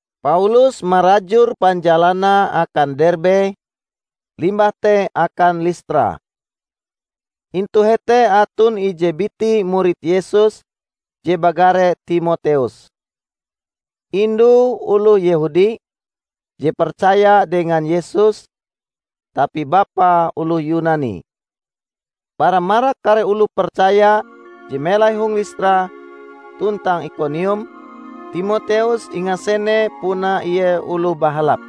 Paulus marajur panjalanae akan Derbe, limbah te akan Listra. Intu hete aton ije biti murid Yesus je bagare Timoteus. Indue oloh Yehudi, je percaya dengan Yesus; tapi bapae oloh Yunani. Bara marak kare oloh percaya je melai hong Listra tuntang Ikonium, Timoteus ingasene puna ie oloh bahalap.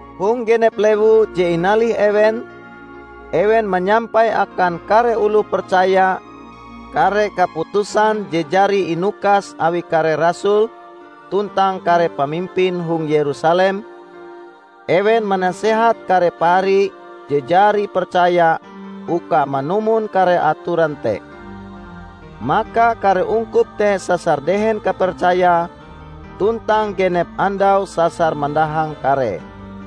Hong genep lewu je inalih ewen, ewen manyampai akan kare oloh percaya kare kaputusan je jari inukas awi kare rasul tuntang kare pamimpin hong Yerusalem, ewen manasehat kare pahari je jari percaya uka manumon kare atoran te. Maka kare ungkup te sasar dehen kapercayae, tuntang genep andau sasar mandahang karee.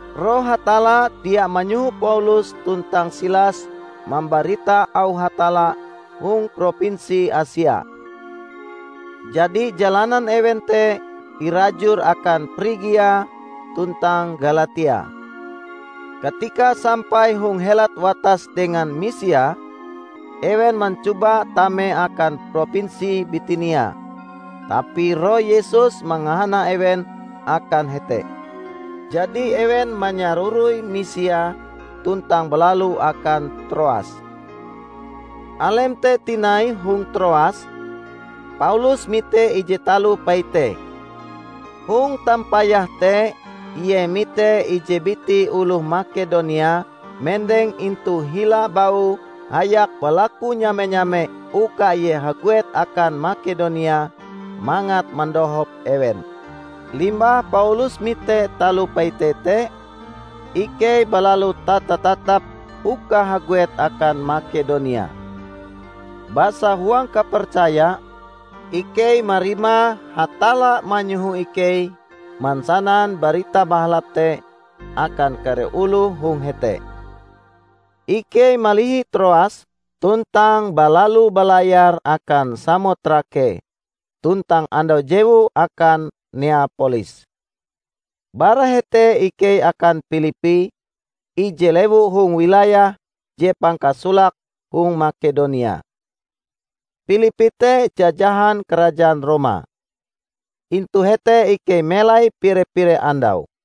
Roh Hatalla dia manyoho Paulus tuntang Silas mambarita auh Hatalla hong propinsi Asia. Jadi jalanan ewen te irajur akan Prigia tuntang Galatia. Katika sampai hong helat watas dengan Misia, ewen mancoba tame akan propinsi Bitinia, tapi Roh Yesus mangahana ewen akan hete. jadi ewen manyaroroi Misia tuntang balalu akan Troas. Alem te tinai hong Troas, Paulus mite ije taloh paite. Hong tampayahe te ie mite ije biti oloh Makedonia mendeng intu hila baue hayak balaku nyame-nyame uka ie haguet akan Makedonia mangat mandohop ewen. Limbah Paulus mite taloh paite te, ikei balalu tata-tatap uka haguet akan Makedonia. Basa huang kapercaya, ikei marima Hatalla manyoho ikei mansanan Barita Bahalap te akan kare oloh hong hete. Ikei malihi Troas tuntang balalu balayar akan Samotrake, tuntang andau jewue akan Neapolis. Bara hete ikei akan Pilippi, ije lewu hong wilayah je pangkasolake hong Makedonia. Pilippi te jajahan karajaan Roma. Intu hete ikei melai pire-pire andau.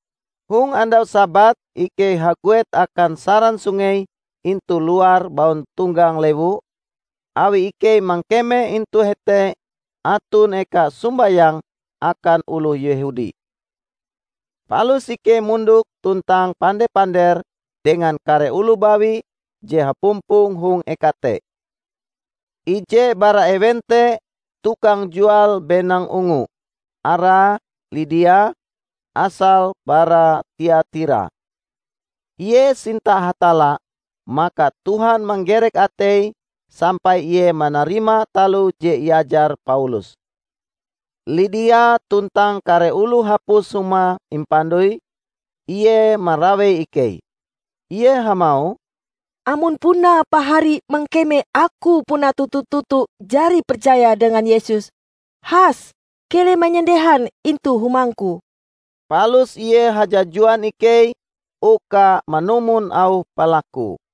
Hong andau Sabat ikei haguet akan saran sungei intu luar bauntonggang lewu, awi ikei mangkeme intu hete aton eka sombayang akan oloh Yehudi. Palus ikei mondok tuntang pande-pander dengan kare oloh bawi je hapumpong hong eka te. Ije bara ewen te tukang jual benang ungu, arae Lidia, asale bara Tiatira. Ie sinta Hatalla, maka Tuhan manggerek ateie sampai ie manarima taloh je iajar Paulus. Lidia tuntang kare oloh hapus humae impandoi, ie marawei ikei. Ie hamauh, "Amon puna pahari mangkeme aku puna toto-toto jari percaya dengan Yesus, has keleh manyandehan intu humangku." Palus ie hajajuan ikei uka manumon auh palakue.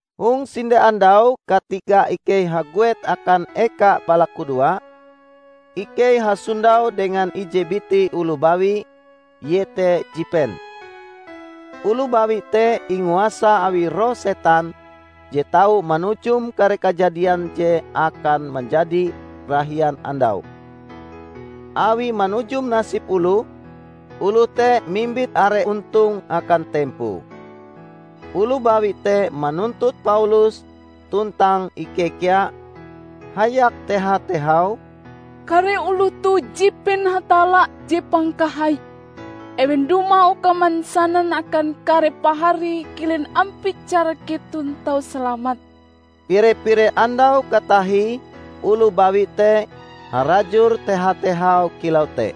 Hong sinde andau katika ikei haguet akan eka balakudoa, ikei hasondau dengan ije biti oloh bawi; ie te jipen. Oloh bawi te inguasa awi roh setan je tau manujum kare kajadian je akan manjadi rahian andau. Awie manujum nasib oloh, oloh te mimbit are ontong akan tempoe. Oloh bawi te manuntut Paulus tuntang ikei kea, hayak teha-tehau, "Kare oloh toh jipen Hatalla Je Pangkahai! Ewen dumah uka mansanan akan kare pahari kilen ampie cara keton tau salamat!" Pire-pire andau katahie oloh bawi te harajur teha-tehau kilau te.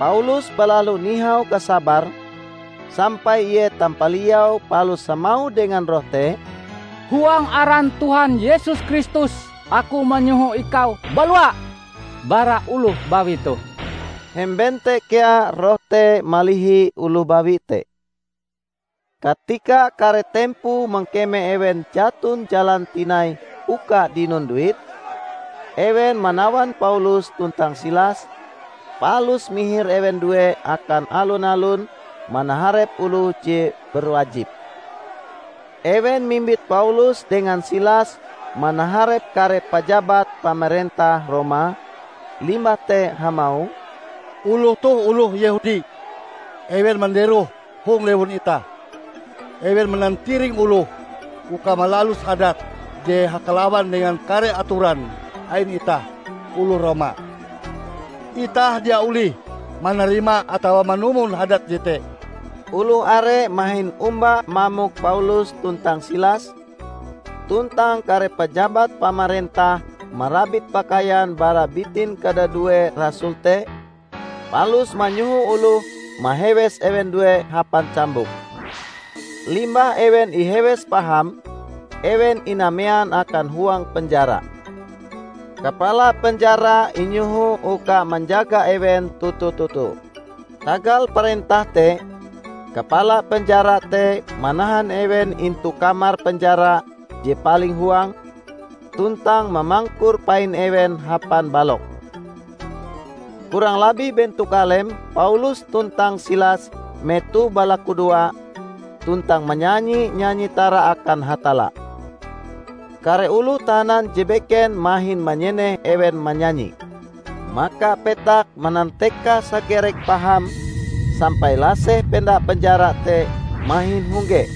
Paulus balalu nihau kasabare, sampai ie tampaliau palus hamauh dengan roh te, "Huang aran Tuhan Yesus Kristus aku manyoho ikau balua bara oloh bawi toh!" Hemben te kea roh te malihi oloh bawi te. Katika kare tempoe mangkeme ewen jaton jalan tinai uka dinon duit, ewen manawan Paulus tuntang Silas, palus mihir ewen due akan alun-alun manaharep oloh je berwajib. Ewen mimbit Paulus dengan Silas manaharep kare pajabat pamarentah Roma, limbah te hamauh, "Oloh toh oloh Yehudi. Ewen manderoh hong lewun itah. Ewen manantiring oloh uka malalus hadat je hakalawan dengan kare atoran ain itah oloh Roma. Itah dia olih manarima atawa manumon hadat jete!" Oloh are mahin omba mamok Paulus tuntang Silas; tuntang kare pajabat pamarentah marabit pakaian bara bitin kadadue rasul te palus manyoho oloh mahewes ewen due hapan cambuk. Limbah ewen ihewes paham, ewen inamean akan huang penjara. Kapala penjara inyoho uka manjaga ewen toto-toto. Tagal parentah te, kapala penjara te manahan ewen intu kamar penjara je paling huang, tuntang mamangkur pain ewen hapan balok. Kurang labih bentok alem Paulus tuntang Silas metoh balakudoa tuntang manyanyi nyanyi tara akan Hatalla. Kare oloh tahanan je beken mahin manyeneh ewen manyanyi. Maka petak manantekas hagerek paham sampai laseh penda penjara te mahin hongge.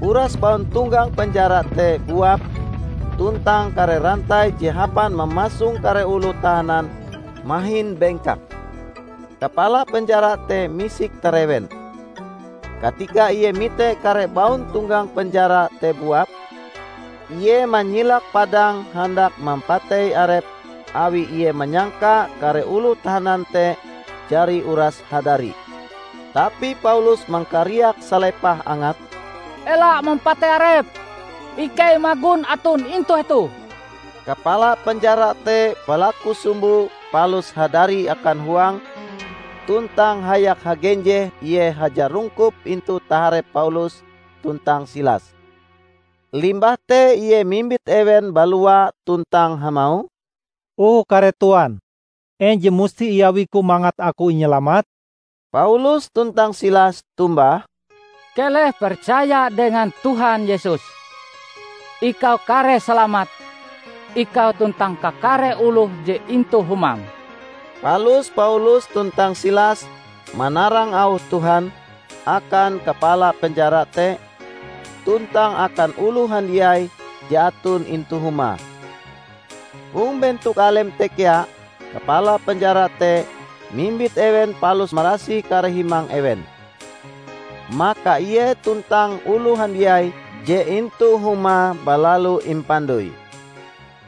Uras bauntonggang penjara te buap tuntang kare rantai je hapan mamasong kare oloh tahanan mahin bengkak. Kapala penjara te misik tarewen. Katika ie mite kare bauntonggang penjara te buap, ie manyilak padang handak mampatei arepe awi ie manyangka kare oloh tahanan te jari uras hadari. Tapi Paulus mangkariak salepah angate, "Ela mampatei arepm! Ikei magon aton intu hetoh!" Kapala penjara te balaku sumbo palus hadari akan huang, tuntang hayak hagenjeh ie hajarungkup intu taharep Paulus tuntang Silas. Limbah te ie mimbit ewen balua tuntang hamauh, "O kare Tuan, en je musti iawiku mangat aku inyalamat?" Paulus tuntang Silas tombah, "Keleh percaya dengan Tuhan Yesus! Ikau kareh salamat -- ikau tuntang kakare oloh je intu humam!" Palus Paulus tuntang Silas manarang auh Tuhan akan kapala penjara te tuntang akan oloh handiai je aton intu humae. Hong bentok alem te kea kapala penjara te mimbit ewen palus marasih kare himang ewen. Maka ie tuntang oloh handiai je intu humae balalu impandoi.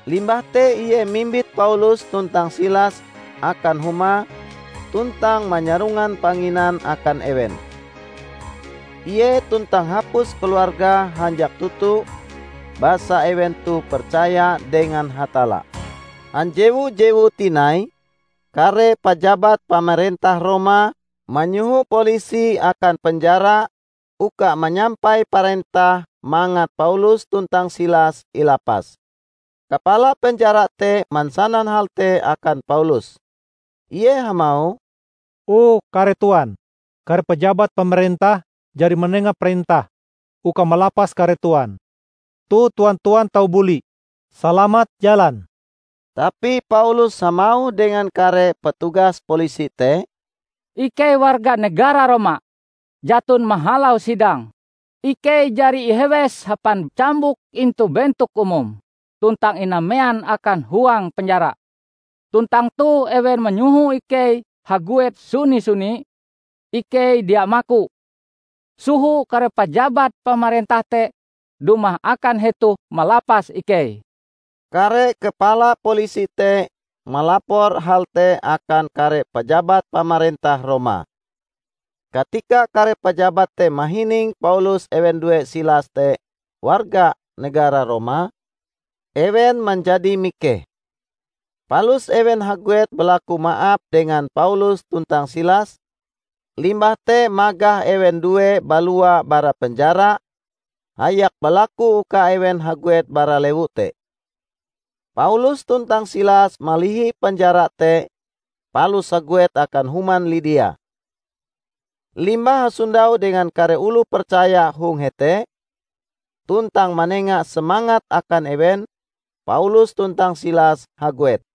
Limbah te ie mimbit Paulus tuntang Silas akan humae tuntang manyarongan panginan akan ewen. Ie tuntang hapus keluargae hanjak toto basa ewen toh percaya dengan Hatalla. Hanjewu jewue tinai, kare pajabat pamarentah Roma manyoho Polisi akan penjara uka manyampai parentah mangat Paulus tuntang Silas ilapas. Kapala penjara te mansanan hal te akan Paulus. Ie hamauh, "O kare Tuan, kare pajabat pamarentah jari manenga parentah uka malapas kare Tuan. Toh tuan-tuan tau buli, Salamat jalan!" Tapi Paulus hamauh dengan kare petugas polisi te, "Ikei warga negara Roma. Jaton mahalau sidang, ikei jari ihewes hapan cambuk intu bentok umum tuntang inamean akan huang penjara. Tuntang toh ewen manyoho ikei haguet suni-suni? Ikei dia maku! Soho kare pajabat pamarentah te dumah akan hetoh malapas ikei." Kare kepala polisi te malapor hal te akan kare pajabat pamarentah Roma. Katika kare pajabat te mahining Paulus ewen due Silas te warga negara Roma, ewen manjadi mikeh. Palus ewen haguet balaku maap dengan Paulus tuntang Silas, limbah te magah ewen due balua bara penjara, hayak balaku uka ewen haguet bara lewu te. Paulus tuntang Silas malihi penjara te palus haguet akan human Lidia. Limbah hasondau dengan kare oloh percaya hong hete, tuntang manenga semangat akan ewen, Paulus tuntang Silas haguet.